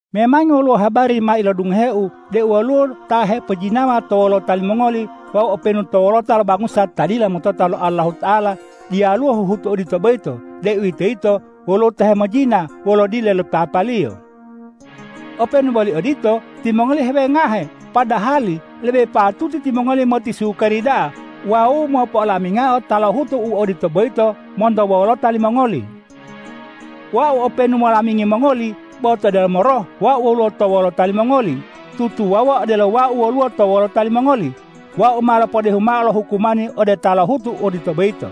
Memangi woluwo habari ma ilodungoheu deu woluwo ta hepojinawa to wolota limongoli wawu openu to wolota lo bangusa ta dila motota lo Allahuta'ala diyaluwo huhutu odito boyito, deuwitoyito woluwo ta hemojina wolo dile li papaliyo. Openu boli odito, timongoli hewengahe, padahali lebe patuti timongoli motisukari da'a wawu mopo'olamingao ta lohutu u odito boyito monto wolota limongoli. Wau openu molamingi mongoli, bo to delomo roh wau woluwo to wolota limongoli. Tutuwawuwa odelo wau woluwo to wolota limongoli, wau ma lopodehu mao lo hukumani ode ta lohutu u odito boyito.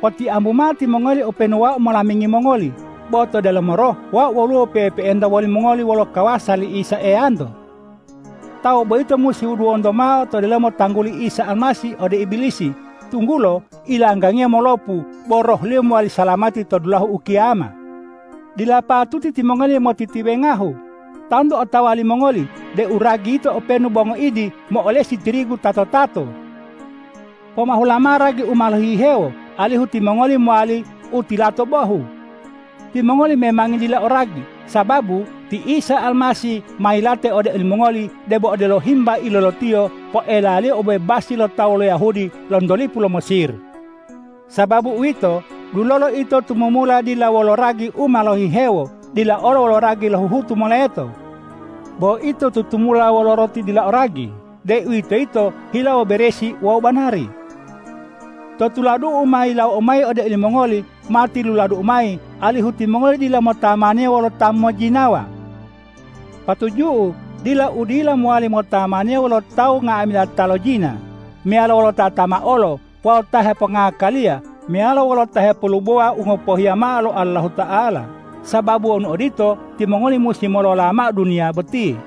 Potiambu mao timongoli openu wau molamingi mongoli, bo to delomo roh wau woluwo pe'epe'enta wolimongoli wolo kawasa li Isa Eyanto. Tawu boyito musi wuduwonto mao to delomo tangguli Isa Almasih ode Ibilisi, tunggulo ilanggangiyo molopu bo rohliyo mowali salamati to dulahu ukiyama. Dila patuti timongoli motitiwengahu. Tantu otawa limongoli deu ragi yito openu bo ngoidi mo'olesi tirigu tato-tato. Pomahula mao ragi u ma lohihewo, alihu timongoli mowali u tilato bohu. Timongoli memangi dila o ragi, sababu ti Isa Almasih ma yilate ode olimongoli debo odelo himba ilolotiyo poelaliyo obebasi lo tawu lo Yahudi lonto lipu lo Mesir. Sababu uwito, dulolo ito tumumula dila wolo ragi u ma lohihewo, dila olo wolo ragi lo huhutu moleto. Bo ito tutumula wolo roti dila o ragi, deuwitoyito hilawo beresi wawu banari. To tuladu'u u ma yilawou mayi ode olimongoli ma tiluladu'u mayi, alihu timongoli dila motamaniya wolo ta mojjinawa. Patuju'u dila udila mowali motamaniya wolo tawu nga'amila ta lojina, meyalo wolo ta tamaolo wawu ta hepongngakaliya meyalo wolo ta hepolubowa u ngopohiya mao lo Allahuta'ala, sababu wonu odito, timongoli musi molola mao duniya boti.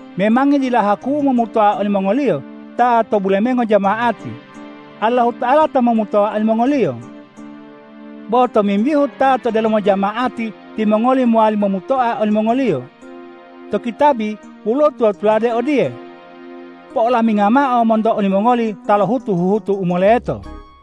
Memangi dila haku'u momutoa olimongoliyo ta to bulemengo jama'ati. Allahuta'ala ta momutoa olimongoliyo. Bo tomimbihu ta to delomo jama'ati, timongoli mowali momutoa olimongoliyo. To kitabi woluwo tula-tuladu odiye,”Po'olaminga mao monto olimongoli ta lohutu huhutu u moleto.”